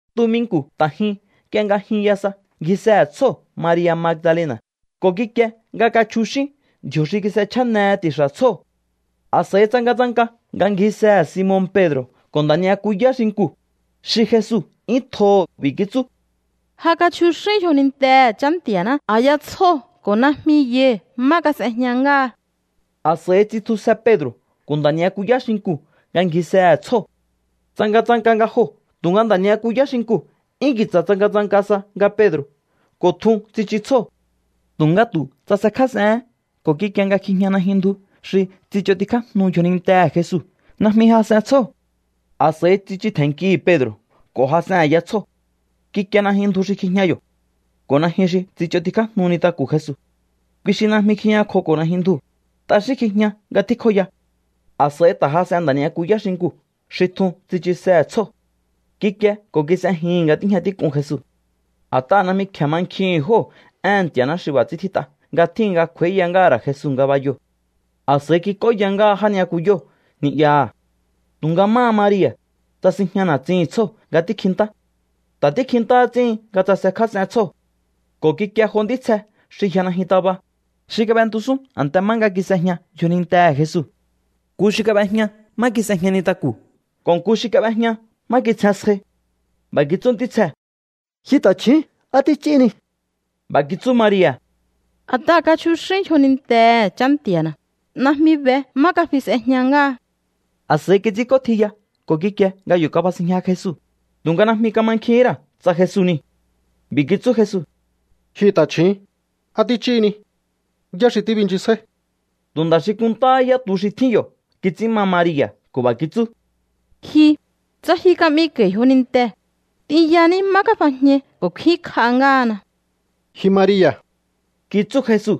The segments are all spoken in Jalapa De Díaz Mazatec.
Tuminku̱ ta̱ jyun nk'ie nga jyunya sa, ngjisehe̱ tsjóo̱ Maria̱ Magdalena̱ ko̱ kikie nga kachjuxín ndji̱o̱ xi kis'echjanehe ti̱xa̱ tsjóo̱. A̱s'a̱i tsangatsanka nga ngjisehe̱ Simon Pedro̱ ko̱ nda̱ ni'yakuyá xinkuu̱ xi Jesu 'yún tjoho̱. B'i̱ kitsú: —¡Ja kachjuxín yjonintehe̱ Chá Nti̱a̱ná a̱ya tsjóo̱ ko̱ najmi yai̱ má kas'ejña ngáha! A̱s'a̱i tsitjusje Pedro̱ ko̱ nda̱ ni'yakuyá xinkuu̱ nga ngjisehe̱ tsjóo̱. Tsangatsanka nga joo̱, tu̱nga nda̱ ni'yakuyá xinkuu̱ 'yún ki̱tsa̱ tsangatsanka sa nga Pedro̱ ko̱ tjun tsichu tsjóo̱. Tu̱nga tu̱ tsasekjás'ehén ko̱ kikie nga kjijña najyun ndju xi tsich'ontikjájnu yjonintehe̱ Jesu. Najmi jas'en tsjóo̱. A̱s'a̱i tsichu tje̱nnkihi̱ Pedro̱ ko̱ jas'en a̱ya tsjóo̱. Kikie najyun ndju xi kjijña yo̱ ko̱ najyun xi tsich'ontikjájnu nintaku̱ Jesu. Kui xi najmi kjijñakjoko̱ najyun ndjuu̱. T'axín kjijña nga tjíkjoya. A̱s'a̱i ta̱ jas'en nda̱ ni'yakuyá xinkuu̱ xi tjun tsichusehe̱ tsjóo̱. Kikie ko̱ kis'ejihi̱n nga tíjña tík'un Jesu. A̱t'aha̱ najmi kje̱e mankjihi̱n jóo̱ éhe̱n Nti̱a̱ná xi b'a̱ ts'ín tjít'a nga tjíhin nga kj'u̱a̱íya ngáha̱ ra̱ Jesu ngabayoo̱. A̱s'a̱i kik'óya ngáha já ni'yakuyóo̱ ni'yaha̱. Tu̱nga máha Maria̱, tsasinjña na̱tsihi̱n tsjóo̱ nga tíkjintá. Ta̱ tíkjintá ts'íhin nga tsasekjás'en tsjóo̱ ko̱ kikie jo ntítsje xi yja najyun taba, xi kab'entusún a̱nte má nga kis'ejña yjonintehe̱ Jesu. Nku xi kab'ejña má kis'ejña nintaku̱ ko̱ nku xi kab'ejña má kitsjen sjai. B'a̱ kitsú ntítsjee̱: —Ji ta̱chju̱ún, ¿á tích'íhini? B'a̱ kitsú Maria̱: —A̱t'aha̱ kachjuxín yjonintehe̱ Chá Nti̱a̱na̱. Najmi be má kafi s'ejña ngáha. A̱s'a̱i kits'ínk'ótjiya ko̱ kikie nga yo̱ kabasinjña Jesu, tu̱nga najmi kamankjihín ra̱ tsa Jesu niu̱. B'i̱ kitsú Jesu: —Ji ta̱chju̱ún, ¿á tích'íhini? ¿Yá xi tíbinchisjáí? Tu̱ nda̱ xi kunntáhá yá tu xi tjín yo̱ kits'ín ma Maria̱ ko̱ b'a̱ kitsú: —Ji, tsa ji ka'miko̱i̱ yjonintee̱, t'inyaní má kafajñai ko̱ kfínkj'a ngáhana. —Ji Maria̱ —kitsú Jesu.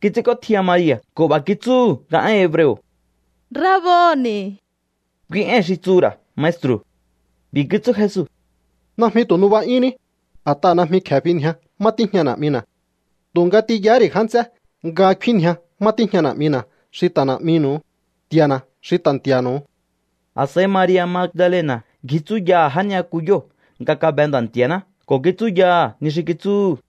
Kits'ínk'ótjiya Maria̱ ko̱ b'a̱ kitsúhu̱ nga én hebreo̱: —¡Raboni̱! Kui éi̱n xi tsuhu̱ ra̱ Maestru̱. B'i̱ kitsú Jesu: —Najmi tu̱ nuba'yúnní, a̱t'aha̱ najmi kje̱e finjia má tíjña Na̱'mina̱. Tu̱nga t'inyahá ri̱ já nts'é nga kfínnjia má tíjña Na̱'mina̱ xi ta̱ Na̱'minu̱u, Nti̱a̱na̱ xi ta̱ Nti̱a̱nu̱u. A̱s'a̱i Maria̱ Magdalena̱ ngji tsúyaha̱ já ni'yakuyóo̱ nga kabe Nda̱ Nti̱a̱ná ko̱ kitsúyaha̱ ni xi kitsúhu̱.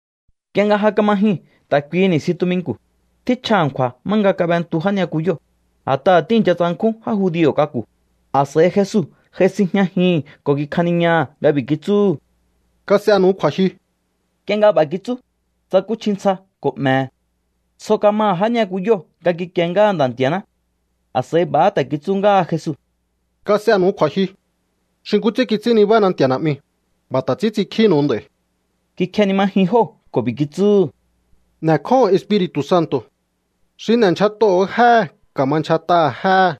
Nk'ie nga ja kama jyuu̱n ta̱ kuihi ni̱stjin tuminku̱, tjíchja a̱nkju̱a̱ má nga kab'entu já ni'yakuyóo̱, a̱t'aha̱ tíi̱ncha tsankjún já judio̱ k'aku̱. A̱s'a̱i Jesu j'ai sinjñajihi̱n ko̱ kikjaniñaha̱ nga b'i̱ kitsúhu̱: —Kas'enu̱u kju̱a̱jyu. Nk'ie nga b'a̱ kitsú, tsakúchji ntsja ko̱ 'me̱he̱. Tsjo kamaha̱ já ni'yakuyóo̱ nga kikie ngáha Nda̱ Nti̱a̱ná. A̱s'a̱i b'a̱há ta̱ kitsú ngáha Jesu: —Kas'enu̱u kju̱a̱jyu. Xi nkú ts'ín kits'ín nibána Nti̱a̱ Na̱'miu̱, b'a̱ ta̱ ts'ín ts'inkjínu̱u nd'a̱i̱. Kikjenimajin jóo̱ ko̱ b'i̱ kitsúhu̱: —N'e̱kjóho̱on Espiri̱tu̱ Santo̱. Xi n'e̱ndyjat'oho̱o jéhe̱ ka̱ma ndyjat'aha̱ jéhe̱.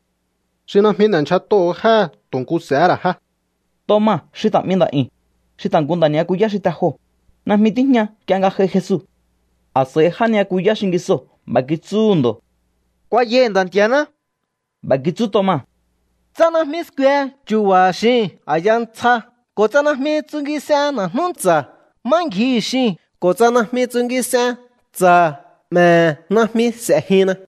Xi najmi n'e̱ndyjat'oho̱o jéhe̱ tu̱ nku s'e̱hé ra̱ jé. Toma xi ta̱ 'mi nda̱'yu̱n, xi ta̱ nku nda̱ ni'yakuyá xi te joo̱, najmi tíjña nk'ie nga j'ai Jesu. A̱s'a̱i já ni'yakuyá xingisoo̱ b'a̱ kitsúhu̱ ndo̱: —Kuayai̱ Nda̱ Nti̱a̱ná. B'a̱ kitsú Toma: —Tsa najmi skue chu̱ba̱ha̱ xiu̱n a̱ya ntsja ko̱ tsa najmi tsungis'en na̱jnú ntsa̱ má ngjihi̱ xiu̱n ko̱ tsa najmi tsungis'en ntsa̱ 'me̱he̱, najmi s'e̱jinna.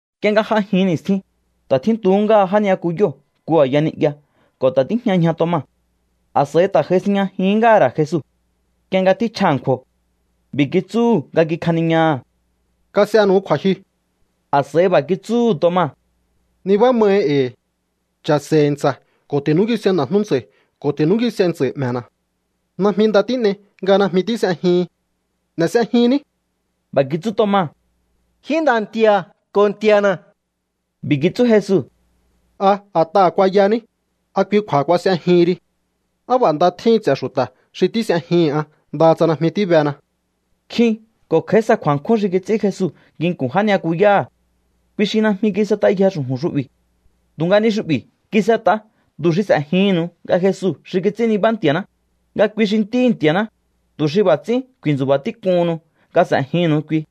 Nk'ie nga j'a jin ni̱stjin, ta̱ tjíntuhú ngáha já ni'yakuyóo̱ nku a̱ya ni'ya ko̱ ta̱ tíjña ñja Toma. A̱s'a̱i ta̱ j'ai sinjñajihín ngáha̱ ra̱ Jesu, nk'ie nga tjíchja a̱nkju̱o̱. B'i̱ kitsúhu̱ nga kikjaniñaha̱: —Kas'enu̱u kju̱a̱jyu. A̱s'a̱i b'a̱ kitsúhu̱ Toma: —Nibá mahi e̱i̱. Cha̱se̱i̱hi̱ ntsa̱ ko̱ ti̱núngis'ein na̱jnú ntsa̱i̱ ko̱ ti̱núngis'ein ntsa̱i̱ 'me̱na̱. Najmi nda tín'ei nga najmi tís'ejihin. N'e̱ s'ejinní. B'a̱ kitsú Toma: —¡Ji Nda̱ Nti̱a̱ ko̱ Nti̱a̱na̱! B'i̱ kitsú Jesu: —¿A a̱t'aha̱ kuayaní, a kui kju̱a̱ha kuas'ejihin ri? Á b'a̱ nda tjíhin ts'e̱ xu̱ta̱ xi tís'ejihi̱n an ndaha tsa najmi tíbena. Nkjin ko̱ kj'a̱í sa kju̱a̱nkjún xi kits'ín Jesu nginku̱n já ni'yakuyáha̱. Kui xi najmi kis'et'ayje xu̱ju̱n xu'bi̱. Tu̱nga ni xu'bi̱ kis'et'a tu̱ xi s'e̱jihi̱nnu̱u nga Jesu xi kits'ín nibá Nti̱a̱ná, nga kui xi Ntíhi̱ Nti̱a̱ná, tu̱ xi b'a̱ ts'ín ku̱i̱ntsu̱ba̱ tík'uhunnu nga s'e̱jinnu̱u kui.